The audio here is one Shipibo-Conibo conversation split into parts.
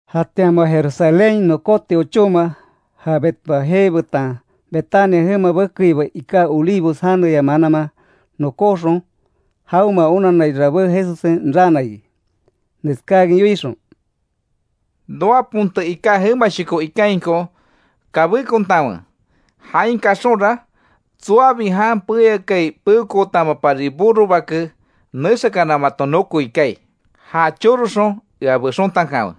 Jatian moa Jerusalénhain nokóti ochóma, ja Betfagé betan Betania jema bekeiba iká Olivos janeya mananman nokóxon, jaonmea onanai rabé Jesussen raana iki, neskáakin yoixon: —Noa ponte iká jemashoko ikainko kabékontanwe. Jain kaxonra tsoabi jan peyakai peokootamapari burro bake nexakana maton nokoi kaai. Ja choroxon ea bexontankanwe.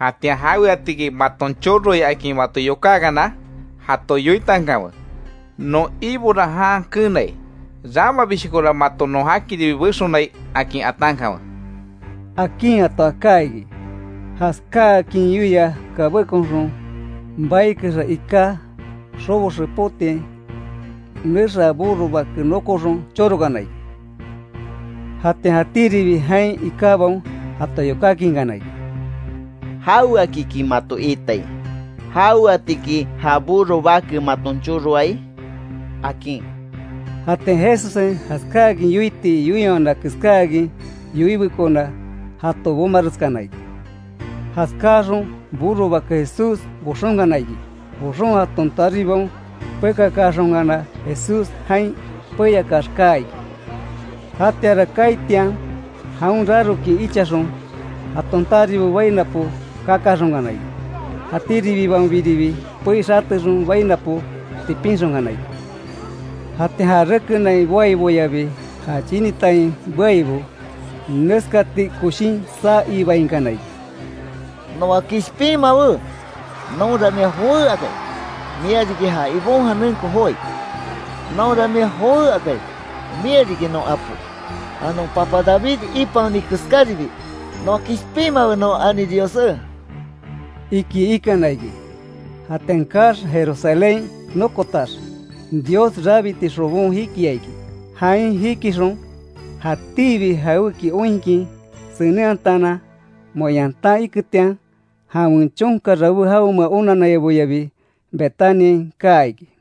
Jatian jaweatiki maton choroai akin mato yokákana, jato yoitankanwe: Non Ibora jan keenai. Ramabishokora mato non jakiribi bexonai akin atankanwe —akin jato aká iki. Jaskáakin yoia kabékonxon baikexa iká xobo xepotiain nexaa burro bake nokoxon chorokana iki. Jatian jatíribi jain ikábaon jato yokákinkana iki: —¿Jaweakiki mato iitai? ¿Jaweatiki ja burro bake maton choroai? —akin. Jatian Jesussen jaskáakin yoiti yoiwana keskáakin yoibekona, jato bomareskana iki. Jaskáaxon burro bake Jesús boxonkana iki. Boxon jaton taribaon pekakaaxonkana, Jesús jan peyakax kaa iki. Jatianra kaaitian jaon rarokin ichaxon jaton taribo bainapo kakaaxonkana iki. Jatiribibaonbiribi pei xatexon bainapo tipinxonkana iki. Jatian ja rekenain boaiboyabi ja chinitain beaibo neskati koshin saa ibainkana iki: —¡Noa kishpinmawe! ¡Nonra mia jowé akai, mia riki ja Ibon janenko joái! ¡Nonra mia jowé akai, mia riki non apo; ja non papa David ipaoni keskáribi! Noa kishpinmawe non ani Diossé —iki ikana iki. Jatian kaax, Jerusalénhain nokotax, Dios rabiti xobon jikia iki. Jain jikixon, jatíbi jawéki oinkin senenhatanan, moa yantan iketian, jawen chonka rabé jaonmea onanaiboyabi Betaniain kaa iki.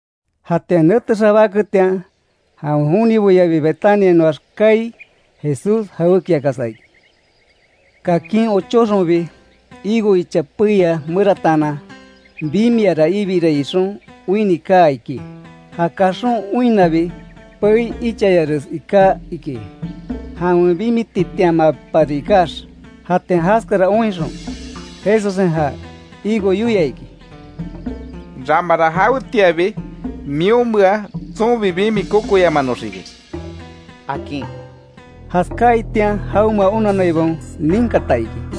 Jatian nete xabáketian, jawen joniboyabi Betaniainoax kaai, Jesús jawékiakasa iki. Kakin ochóxonbi, higo icha peia merataanan, bimiara ibirai ixon oinni kaa iki. Ja kaxon oinnabi, pei ichayares iká iki, jawen bimititianmapari ikax. Jatian jaskara oinxon, Jesussen ja higo yoia iki: —Ramara jawetianbi, mionmea tsonbi bimi kokoyamanoxiki —akin. Jaskaitian jaonmea onanaibaon ninkata iki.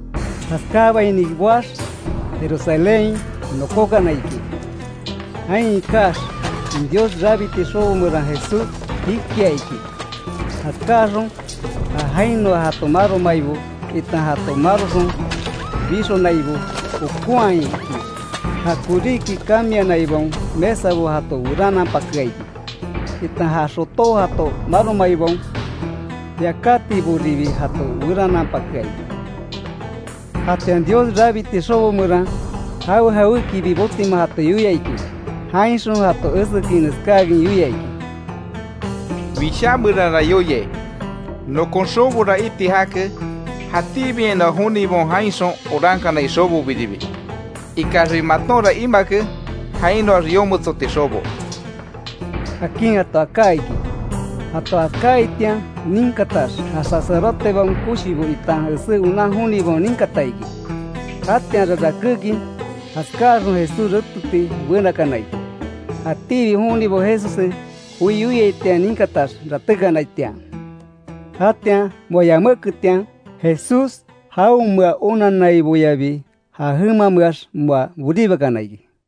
Jaskáabaini boax, Jerusalénhain nokókana iki. Jain ikax, Dios rabiti xobo meran Jesús jikia iki. Jaskáxon, ja jainoa jato maromaibo, itan jato maroxon bixonaibo jokonhaa iki. Ja koríki cambianaibaon mesabo jato werananpakea iki, itan ja xotó jato maromaibaon yakátiboribi jato werananpakea iki. Jatian Dios rabiti xobo meran, jawe jawékibi botima jato yoia iki. Jainxon jato esekin neskáakin, yoia iki: —Wishá meranra yoiai: ‘Nokon xobora iti jake, jatíbiainoa jonibaon jainxon orankanai xobobiribi’. Ikaxbi matonra imake jainoax yometsoti xobo —akin jato aká iki. Jato jaskáaitian ninkatax, ja sacerdotebaon koshibo itan esé onan jonibaon ninkata iki. Jatianra rakékin, jaskáaxon Jesús reteti benakana iki. Jatíbi jonibo Jesussen joi yoiaitian ninkatax ratékanaitian. Jatian moa yaméketian, Jesús, jaonmea onanaiboyabi ja jemameax moa boribakana iki.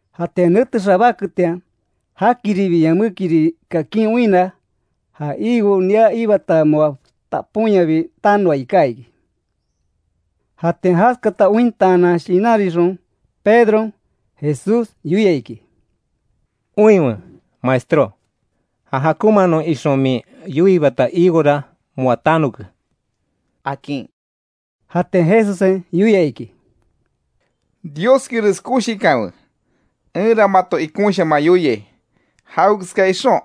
Jatian nete xabáketian, jakiribi yamékiri kakin oinna, ja higo nia iibata moa taponyabi tanoa iká iki. Jatian jaskata ointaanan shinanrixon, Pedron, Jesús yoia iki: —Oinwe, Maestro. Ja jakonmaanon ixon min yoiibata higora moa tanoke —akin. Jatian Jesussen yoia iki: —Dioskires koshikanwe. Enra mato ikonshaman yoiai, jawekeska ixon,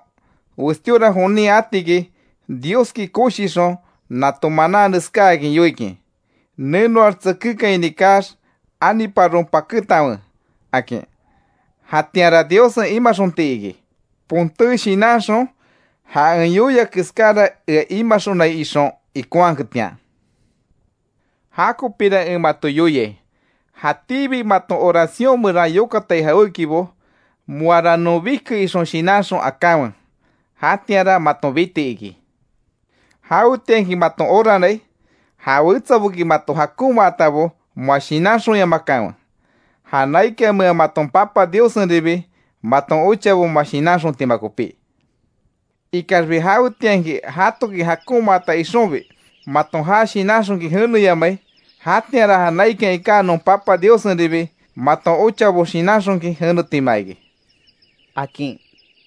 westíora jonin atiki Dioski koshixon, nato manan neskáakin yoikin: Nenoax tsekékaini kaax, aniparon pakétanwe akin. Jatianra Diossen imaxonti iki, ponté shinanxon, ja en yoia keskára ea imaxonai ixon ikonhaketian. Jakopira en mato yoiai, jatíbi maton oración meran yokatai jawékibo, moara non bike ixon shinanxon akanwe. Jatianra maton biti iki. Jawetianki maton oranai, ja wetsaboki mato jakonmaatabo moa shinanxonyamakanwe. Ja naikanmea maton Papa Diossenribi, maton ochabo moa shinanxontima kopí. [Ikaxbi jawetianki, jatoki jakonmaata ixonbi, maton ja shinanxonkin jeneyamai, jatianra ja naikan iká non Papa Diossenribi maton ochabo shinanxonkin jenetima iki] —akin.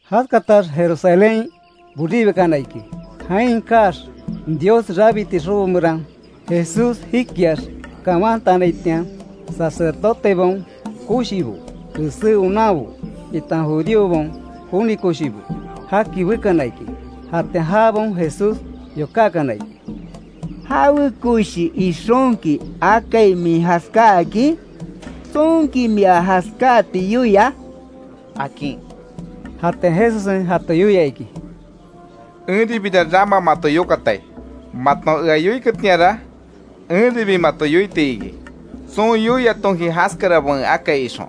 Jaskatax Jerusalénhain, boribakana iki. Jain kaax, Dios rabiti xobo meran Jesús jikiax kawantanaitian, sacerdotebaon koshibo, esé onanbo, itan judíobaon joni koshibo, jaki bekana iki. Jatian jabaon Jesús yokákana iki: —¿Jawe koshi ixonki akai min jaskáakin? ¿Tsonki mia jaskáati yoia? —akin. Jatian Jesussen jato yoia iki: —Enribira rama mato yokatai. Maton ea yoiketianra, enribi mato yoiti iki, tson yoiatonki jaskarabo en akai ixon.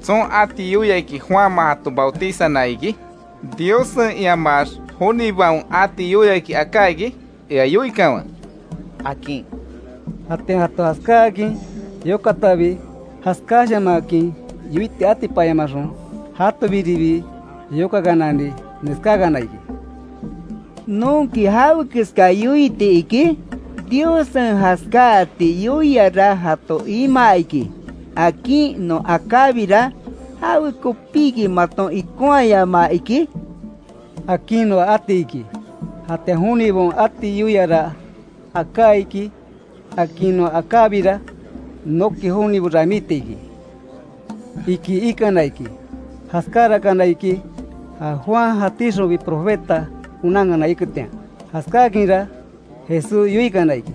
Tson ati yoiaki, Juanman jato bautizana iki ¿Diossen, iamax jonibaon ati yoiaki aká iki? Ea yoikanwe —akin. Jatian jato jaskáakin yokatabi, jaskáshamanhakin yoiti atipanyamaxon, jatobiribi yokakanani neskákana iki: —¿Nonki jawekeska yoiti iki? Diossen jaskaáti yoiara jato imaa iki, akin non akábira: ¿Jawekopiki maton ikonhayamaa iki? Akin noa ati iki. Jatian jonibaon ati yoiara aká iki, akin non akábira, noki jonibo ramíti iki —iki ikana iki. Jaskárakana iki, ja Juan jatíxonbi profeta onankana iketian. Jaskákinra, Jesús yoikana iki: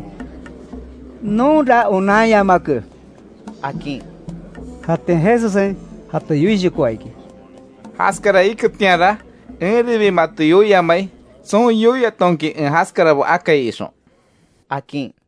—Nonra onanyamake —akin. Jatian Jesussen jato yoishokoa iki: —Jaskara iketianra, enribi mato yoiamai, tson yoiatonki en jaskarabo akai ixon —akin.